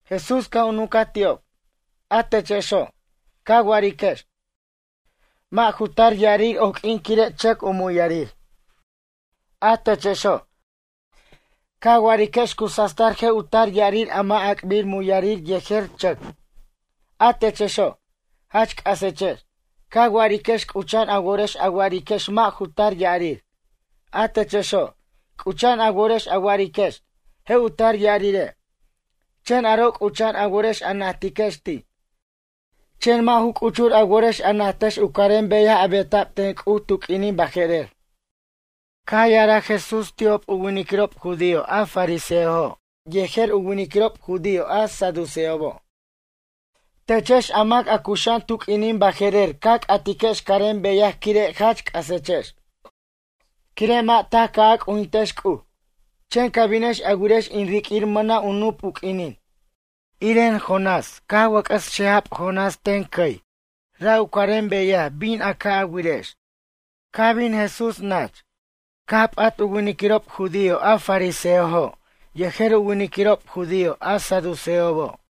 Jesús caj u nuncaj ti'ob: ―A techexo', ca wa'ariquex: “Mʌ' ju tar ya'arir oq'uin quire' chʌc u muyarir.” A techexo', ca wa'ariquex cu sastar je' u tar ya'arir a mʌ' ac'bir u muyarir yejer chʌc. A techexo', jach c'asechex. Ca wa'ariquex c'ucha'an a worex a wa'ariquex mʌ' ju tar ya'arir. A techexo', c'ucha'an a worex a wa'ariquex: Je' u tar ya'arire'. Chen aro' c'ucha'an a worex a najtiquex ti'. Chen mʌ' ju c'uchur a worex a najtex u carem beyaj a beta'b ten C'uj tu q'uinin baje'rer. Caj ya'araj Jesús ti'ob u winiquirob judío a fariseojo' yejer u winiquirob judío a saduceobo': ―Techex a mac a cuxa'an tu q'uinin baje'rer ca c'atiquex carem beyaj quire' jach c'asechex. Quire' mʌ' taj caj a c'ujintex C'uj. Chen ca binex a wirex in riq'uir mʌna' u nup u q'uinin. Iren Jonás caj wʌc'ʌs xeja Jonás ten cʌy quire' C'uj. Ra' u carem beyaj bin a ca' a wirex. Caj bin Jesús nach, caj p'at u winiquirob judío a fariseojo' yejer u winiquirob judío a saduceobo'.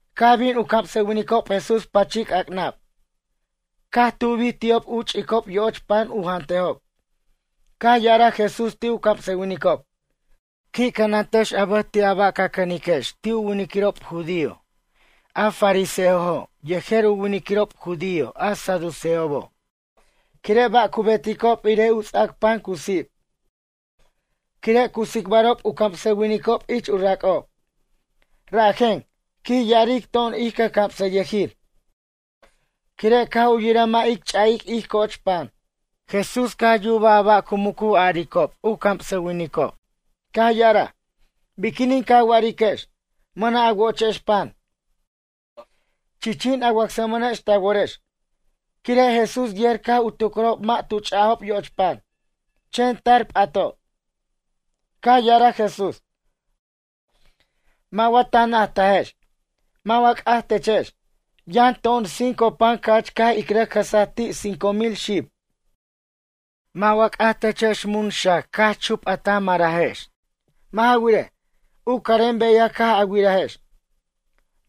Caj bin u camsʌwinicob Jesús pʌchi c'ac'nab. Caj tubi ti'ob u ch'icob yo'och pan u jantejob. Caj ya'araj Jesús ti' u camsʌwinicob: ―Qui' cʌnantex a bʌj ti' a ba' ca cʌniquex ti' u winiquirob judío a fariseojo' yejer u winiquirob judío a saduceobo'. Quire' ba' cu beticob irej u ts'ac pan cu sip. Quire' cu tsicbarob u camsʌwinicob ich u rac'ob: ―Rajen ―quij ya'aric to'on ij cʌjcamsʌyʌjir― quire' caj u yiraj mʌ' ic ch'a'ic ij co'och pan. Jesús caj yubaj a ba' cu muc u aricob u camsʌwinicob. Caj ya'araj: ―Biquinin ca wa'ariquex: “Mʌna' a wochex pan.” Chichin a wacsamʌnex ta worex. Quire' Jesús yer caj u tucrajob mʌ' tu ch'ajob yo'och pan. Chen tar p'ato'. Caj ya'araj Jesús: ―Mʌ' wa ta najtajex? Mʌ' wa c'aj techex? Yʌn to'on cinco pan ca'ch caj in rʌc jʌsaj ti' cinco mil xib. Mʌ' wa c'aj techex mun xac cax chup a ta marex? Mʌ' ja wirej, u carem beyaj caj a wirajex?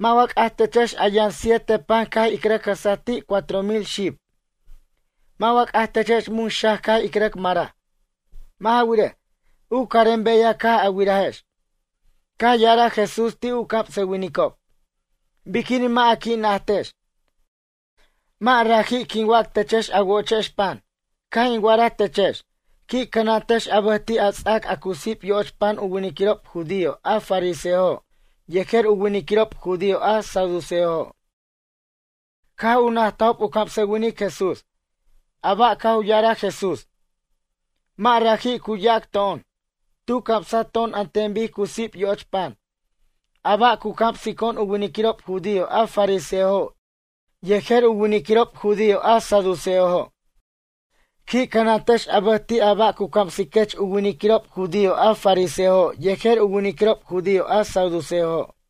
Mʌ' wa c'aj techex a yʌn siete pan caj in rʌc jʌsaj ti' cuatro mil xib. Mʌ' wa c'aj techex mun xac caj ic rʌc maraj. Mʌ' ja wirej, u carem beyaj caj a wirajex? Caj ya'araj Jesús ti' u camsʌwinicob: ―Biquinin mʌ' a qui' najtajex? Mʌ' raji' quin wac techex a wo'ochex pan. Caj in wa'araj techex, qui' cʌnantex a bʌj ti' a ts'ac a cu sip yo'och pan u winiquirob judío a fariseojo' yejer u winiquirob judío a saduceojo'. Caj u najtajob u camsʌwinic Jesús: “A ba' caj u ya'araj Jesús, mʌ' raji' cu yac to'on. Tu camsa to'on an ten bic cu sip yo'och pan, a ba' cu camsico'on u winiquirob judío a fariseojo' yejer u winiquirob judío a saduceojo'. Qui' cʌnantex a bʌj ti' a ba' cu camsiquech u winiquirob judío a fariseojo' yejer u winiquirob judío a saduceojo'.”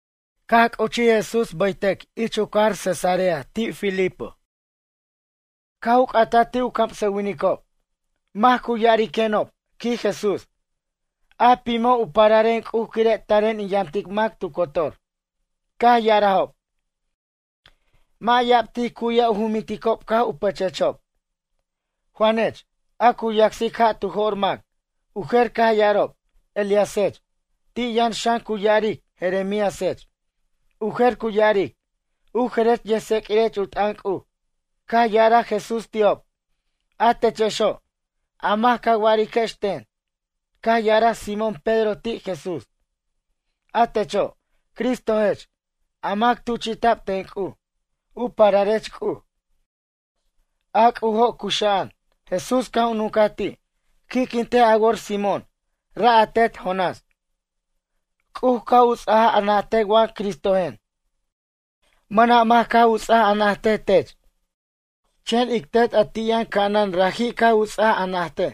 Caj c'uchij Jesús bʌytʌc ich u cajar Cesarea de Filipo. Caj u c'ataj ti' u camsʌwinicob: ―Mac cu ya'ariquenob ―quij Jesús― a pimo' u pararen C'uj quire' taren in yamtic mac tu cotor? Caj ya'arajob: ―Mʌ' ya'ab tij cu'yaj u juminticob caj u pʌchechob: “Juanech, a cu yacsic ja' tu jo'r mac.” U jer caj ya'arob: “Elíasech.” Ti' yʌn xan cu ya'aric: “Jeremíasech.” U jer cu ya'aric: “U jerech yʌjtseq'uirech u t'ʌn C'uj.” Caj ya'araj Jesús ti'ob: ―A techexo', a mac ca wa'ariquex ten? Caj ya'araj Simón Pedro ti' Jesús: ―A techo', Cristojech, a mac tuchi'ta'b ten C'uj. U pararech C'uj. A C'ujo' cuxa'an. Jesús caj u nuncaj ti': ―Qui'quintej a wor Simón, ra' a tet Jonás. C'uj caj u ts'aj a najtej wa Cristojen. Mʌna' mac caj u ts'aj a najtej tech. Chen ic Tet a ti' yʌn ca'anan raji' caj u ts'aj a najtej.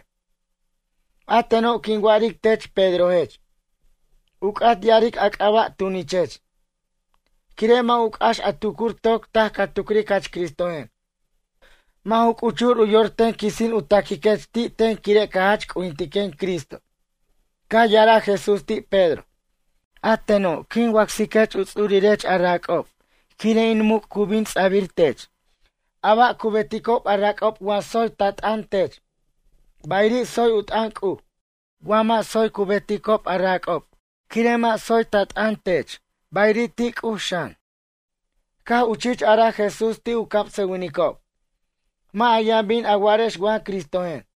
A teno' quin wa'aric tech Pedrojech. U c'at ya'aric a c'aba' Tunichech. Quire' mʌ' u c'ax a tucur toc taj ca tucric jach Cristojen. Mʌ' ju c'uchur u yor ten quisin u taquiquech ti' ten quire' ca jach c'ujintiquen Cristo. Caj ya'araj Jesús ti' Pedro: ―A teno' quin wacsiquech u ts'urirech a rac'ob quire' in muc' cu bin ts'abir tech. A ba' cu beticob a rac'ob wa tsoy ta t'ʌn tech, bayiri' tsoy tu t'ʌn C'uj. Wa mʌ' tsoy cu beticob a rac'ob quire' mʌ' tsoy ta t'ʌn, tech bayiri' ti' C'uj xan. Caj u chich araj Jesús ti' u camsʌwinicob: ―Mʌ' a yʌn bin a wa'arex wa Cristojen.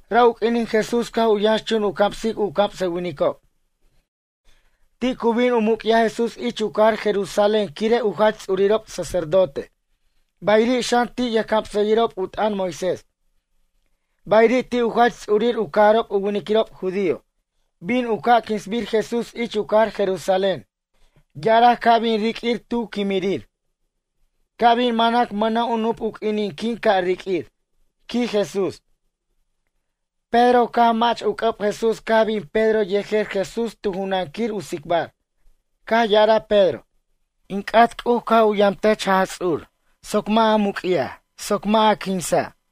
Ra' u q'uinin Jesús caj u yʌnxchun u camsic u camsʌwinicob. Ti' cu bin u muc'yaj Jesús ich u cajar Jerusalén quire' u jach ts'urirob sacerdote. Bayiri' xan ti' yʌjcamsʌyʌjirob u t'ʌn Moisés. Bayiri' ti' u jach ts'urir u cajarob u winiquirob judío. Bin u ca' quinsbir Jesús ich u cajar Jerusalén. Ya'araj ca' bin riq'uir tu quimirir: “Ca' bin manac mʌna' u nup u q'uinin quin ca' riq'uir” ―quij Jesús. Pedro caj mach u c'ʌb Jesús caj bin Pedro yejer Jesús tu junan quir u tsicbar. Caj ya'araj Pedro: ―In c'at C'uj ca' u yamtech Jaj Ts'ur soc mʌ' a muc'yaj soc mʌ' a quinsa'.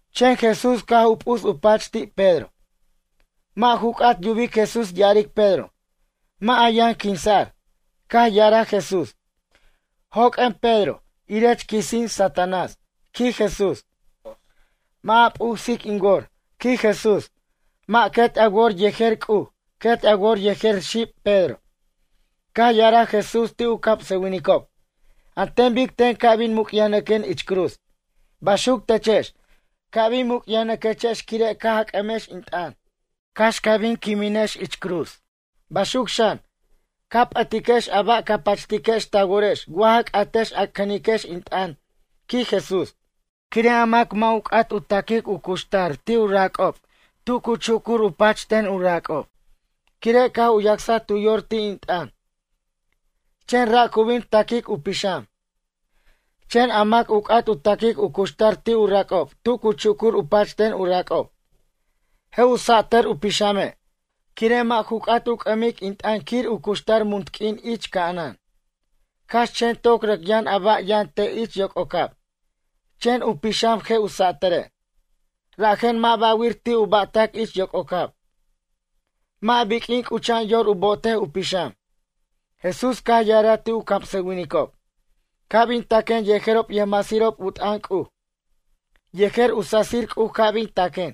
Chen Jesús caj p'us u pach ti' Pedro. Mʌ' ju c'at yubic Jesús ya'aric Pedro: “Mʌ' a yʌn quinsa'r.” Caj ya'araj Jesús: ―Joq'uen Pedro, irech quisin Satanás ―quij Jesús―. Mʌ' a p'usic in wor ―quij Jesús―. Mʌ' quet a wor yejer C'uj, quet a wor yejer xib Pedro. Caj ya'araj Jesús ti' u camsʌwinicob: ―An ten bic ten ca' bin muc'yajnʌquen ich cruz. Baxuc techex, ca' bin mucyajnʌquechex quire' caj a c'amex in t'ʌn, cax ca bin a quimechex ich cruz. Baxuc xan, ca' a p'ʌtiquex a ba' ca pachtiquex ta worex wa ja c'atex a cʌniquex in t'ʌn ―quij Jesús―. Quire' a mac mʌ' u c'at u taquic u cuxtar ti' u rac'ob tu cu chucur u pach ten u rac'ob, quire' caj u yacsaj tu yor ti' in t'ʌn. Chen ra' cu bin taquic u pixam. Chen a mac u c'at u taquic u cuxtar ti' u rac'ob tu cu chucur u pach ten u rac'ob. Je' u satʌr u pixame', quire' mʌ' ju c'at u c'ʌmic in t'ʌn quir u cuxtar munt q'uin ich ca'anan. Cax chen toc rʌc yʌn a ba' yʌn te' ich yoc'ocab. Chen u pixam je' u satʌre'. Rajen mʌ' ba'wir ti' u ba'tʌc ich yoc'ocab. Mʌ' biq'uin c'ucha'an yor u bo'otej u pixam. Jesús caj ya'araj ti' u camsʌwinicob: ―Ca' bin taquen yejerob yʌjmasirob u t'ʌn C'uj. Yejer u sasir C'uj ca' bin taquen.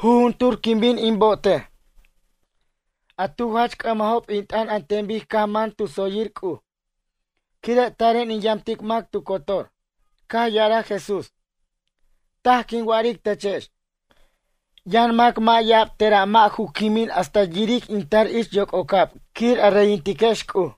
Jujuntur quin bin in bo'otej, a tu jach c'ʌmajob in t'ʌn an ten bic caj man tu tsoyir C'uj. Quire' taren in yamtic mac tu cotor. Caj ya'araj Jesús: ―Taj quin wa'aric techex. Yʌn mac mʌ' ya'ab tera' mʌ' ju quimin hasta yiric in tar ich yoc'ocab quir a reyintiquex C'uj.